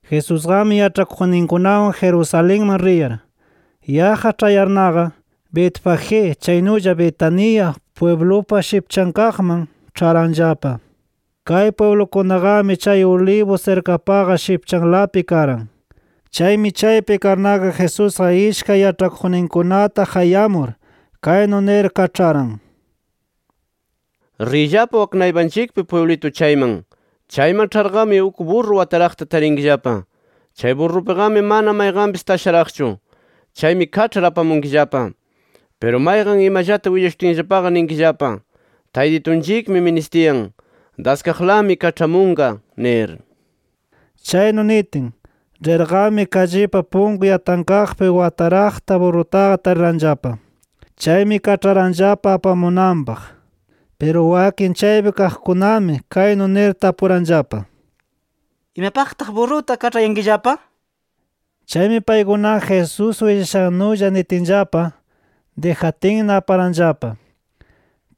Jesusqami yaĉhakuqninkunawan Jerusalenman riyar, yaqqa ĉhayarnaqa, Betfagé chaynulla Betania pwiblupa shipchankaqman ĉharanllapa. Kay pwiblukunaqami chay Olivos sirkapaqa shipchanlapi karan. Chaymi chaypi karnaqa Jesusqa ishkay yaĉhakuqninkunata qayamur, kaynu nir kaĉharan: —Riyllapa wak naypanchikpi pwiblitu chayman. Chayman ĉharqami uk burru wataraqta tarinkillapa. Chay burrupiqami mana mayqanpis tasharaqchu. Chaymi kaĉhar apamunkillapa. Piru mayqan imallata willashutinllapaqa ninkillapa: ‘Taytitunchikmi ministiyan, daskaqlami kaĉhamunqa’ nir. Chaynu nitin, rirqami kallipi punku yatankaqpi wataraqta burrutaqa tariranllapa. Chaymi kaĉharanllapa apamunanpaq. Piru wakin chaypi kaqkunami kaynu nir tapuranllapa: —¿Imapaqtaq burruta kaĉhayankillapa? nir. Chaymi paykunaqa Jesús willashannulla nitinllapa, dijatinna aparanllapa.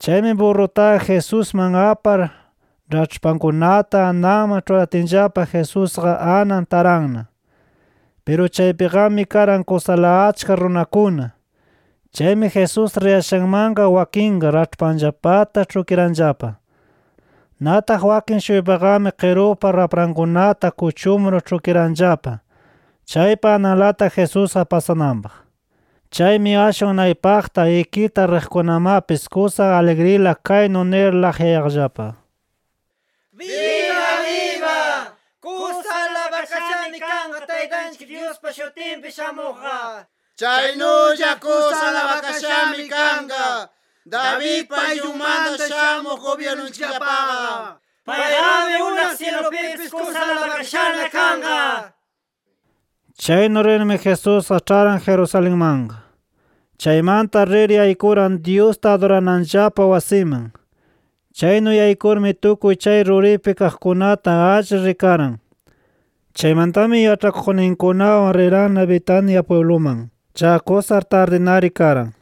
Chaymi burrutaqa Jesusman apar raĉhpankunata ananman ĉhuratinllapa Jesusqa anan taranna. Piru chaypiqami karan kusala achka runakuna. Chaymi Jesús riyashanlawmanqa wakinqa raĉhpanllapata ĉhukiranllapa. Nataq wakin-shuypaqami qirupa raprankunata kuchumur ĉhukiranllapa, chaypa ananlata Jesusqa pasananpaq. Chaymi ashwan naypaqta ikita riqkunamapis kusa aligrila kaynu nir laqyayaqllapa: “¡Biba biba! ¡Kusa alabakashami kanqa Taytanchik Dyuspa shutinpi shamuqqa! ¡Chaynulla kusa alabakashami kanqa Davidpa ayllunmanta shamuq gubyirnunchikllapaqa! ¡Payqami unaq syilupipis kusa alabakashana kanqa!” nir. Chaynu rirmi Jesusqa ĉharan Jerusalenmanqa. Chaymanta rir yaykuran Dyusta adurananllapa wasiman. Chaynu yaykurmi tukuy chay ruripi kaqkunata alli rikaran. Chaymantami yaĉhakuqninkunawan riranna Betania pwibluman. Chaqa kusa tardinari karan.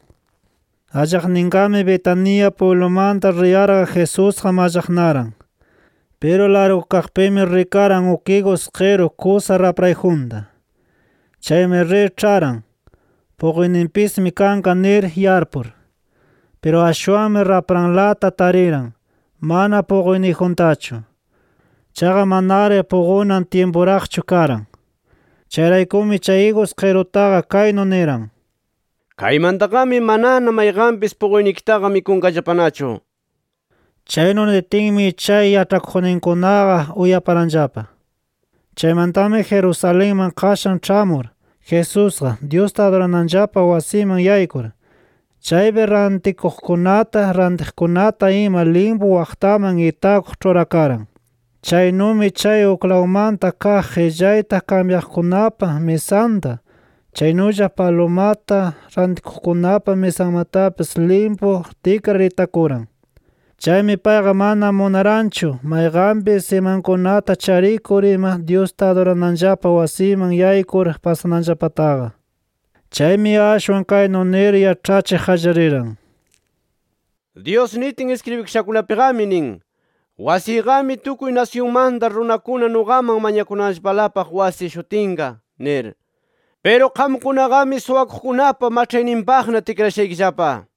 Allaqninqami Betania pwiblumanta riyarqa Jesusqa mallaqnaran. Piru largukaqpimi rikaran uk igus qiru kusa raprayjunta. Chaymi rir ĉharan, puquyninpismi kanqa nir yarpur. Piru ashwanmi rapranlata tariran, mana puquyniyjuntachu. Chaqa manari puqunan tyimpuraqchu karan. Chayraykumi, chay igus qirutaqa kaynu niran: “¡Kaymantaqami manana mayqanpis puquynikitaqa mikunqallapanachu!” nir. Chaynu nitinmi chay yaĉhakuqninkunaqa uyaparanllapa. Chaymantami Jerusalenman qashan ĉhamur, Jesusqa, Dyusta adurananllapa wasiman yaykur, chaypi rantikuqkunata, rantiqkunata ima limpu waqtaman itakuq ĉhurakaran. Chaynumi chay uklawmanta kaq qillayta kambyaqkunapa misanta, chaynulla palumata rantikuqkunapa misanmatapis limpu tikrar itakuran. Chaymi payqa mana munaranchu mayqanpis imankunata charikur ima Dyusta adurananllapa wasiman yaykur pasananllapataqa. Chaymi ashwan kaynu nir yaĉhachiq qallariran: “Dyus nitin iskribikashakunapiqami nin: ‘Wasiyqami tukuy nasyunmanta runakuna nuqaman mañakunanllapalapaq wasi shutinqa’ nir. Piru qamkunaqami suwakuqkunapa maĉhayninpaqna tikrashaykillapa” nir.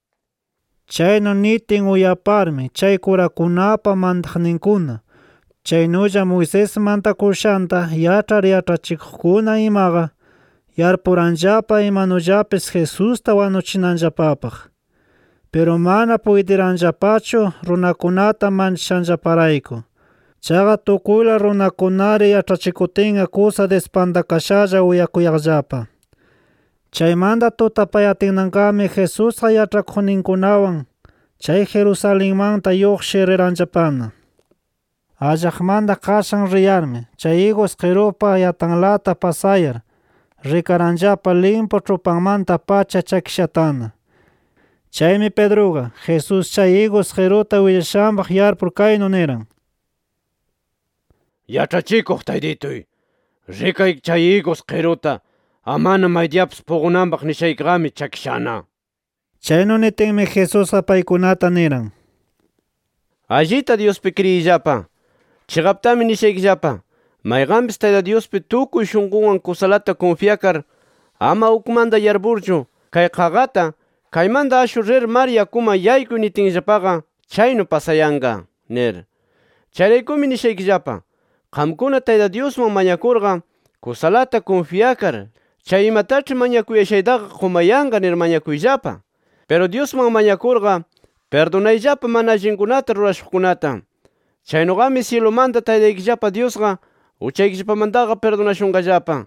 Chaynu nitin uyaparmi chay kurakunapa mantaqninkuna, chaynulla Moisés mantakushanta yaĉhar yaĉhachikuqkuna imaqa, yarpuranllapa imanullapis Jesusta wanuchinanllapapaq. Piru mana puytiranllapachu runakunata manchashanllaparayku. Chaqa tukuyla runakunari yaĉhachikutinqa kusa dispantakashalla uyakuyaqllapa. Chaymanta tutapayatinnaqami Jesusqa yaĉhakuqninkunawan chay Jerusalenmanta lluqshir riranllapana. Allaqmanta qashan riyarmi, chay igus qirupa yatanlata pasayar, rikaranllapa limpu ĉhupanmanta-pacha chakishatana. Chaymi Pedruqa, Jesús chay igus qiruta willashanpaq yarpur kaynu niran: —Yaĉhachikuq Taytituy, rikay chay igus qiruta amana maydiyapis puqunanpaq nishaykiqami chakishana nir. Chaynu nitinmi Jesusqa paykunata niran: —Allita Dyuspi kriyiyllapa. Chiqaptami nishaykillapa: Mayqanpis Tayta Dyuspi tukuy shunqunwan kusalata kunfyakar ama ukmanta yarpurchu, kay qaqata ‘Kaymanta ashur rir mar yakuman yaykuy’ nitinllapaqa, chaynu pasayanqa nir. Chayraykumi nishaykillapa: Qamkuna Tayta Dyusman mañakurqa kusalata kunfyakar, chay imataĉhi mañakuyashaytaqa qumayanqa nir mañakuyllapa. Piru Dyusman mañakurqa, pirdunayllapa mana allinkunata rurashuqkunata. Chaynuqami syilumanta Taytaykillapa Dyusqa uchaykillapamantaqa pirdunashunqallapa. [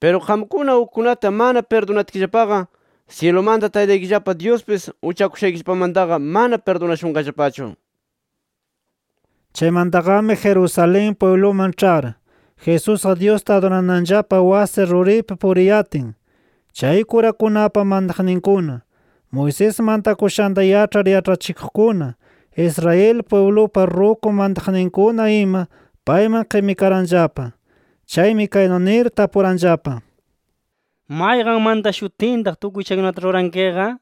Piru qamkuna ukkunata mana pirdunatkillapaqa, syilumanta Taytaykillapa Dyuspis uchakushaykillapamantaqa mana pirdunashunqallapachu.] Chaymantaqami Jerusalén pwibluman ĉhar, Jesusqa Dyusta adurananllapa wasi ruripi puriyatin, chay kurakunapa mantaqninkuna, Moisés mantakushanta yaĉhar yaĉhachikuqkuna, Israel pwiblupa ruku mantaqninkuna ima payman qimikaranllapa. Chaymi kaynu nir tapuranllapa: —¿Mayqan mantashutintaq tukuy chaykunata rurankiqa? nir.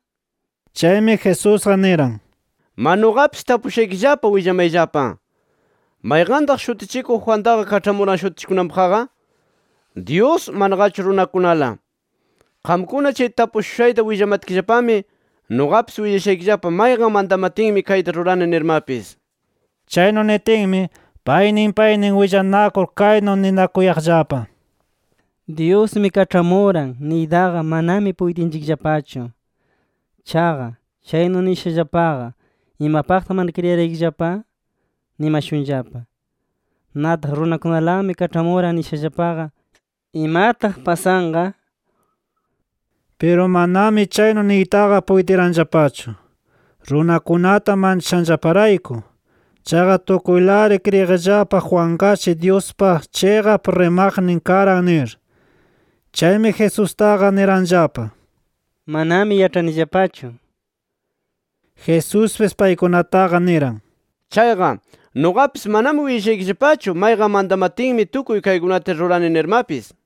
Chaymi, Jesusqa niran: —¡Ma nuqapis tapushutiyllapa willamayllapa! ¿Mayqantaq Shutichikuq Juantaqa kaĉhamuran shutichikunanpaqqa? ¿Dyus, manaqachu runakunala? Qamkuna chay tapushushayta willamatkillapami, nuqapis willashaykillapa mayqan mantamatinmi kayta rurani nirmapis. Chaynu nitinmi, paynin paynin willanakur kaynu ninakuyaqllapa: “ ‘Dyusmi kaĉhamuran’ niytaqa manami puytinchikllapachu. Chaqa, chaynu nishallapaqa ‘¿Imapaqtaq mana kriyiraykillapa?’ nimashunllapa. Nataq ‘Runakunalami kaĉhamuran’ nishallapaqa, ¿imataq pasanqa?” Piru manami chaynu niytaqa puytiranllapachu, runakunata manchashanllaparayku. Chaqa tukuylari kriyiqllapa Juanqashi Dyuspa chiqap rimaqnin karan nir. Chaymi, Jesustaqa niranllapa: —Manami yaĉhanillapachu nir. Jesuspis paykunataqa niran: —Chayqa nuqapis manami willashaykillapachu, mayqan mantamatinmi tukuy kaykunata rurani nirmapis.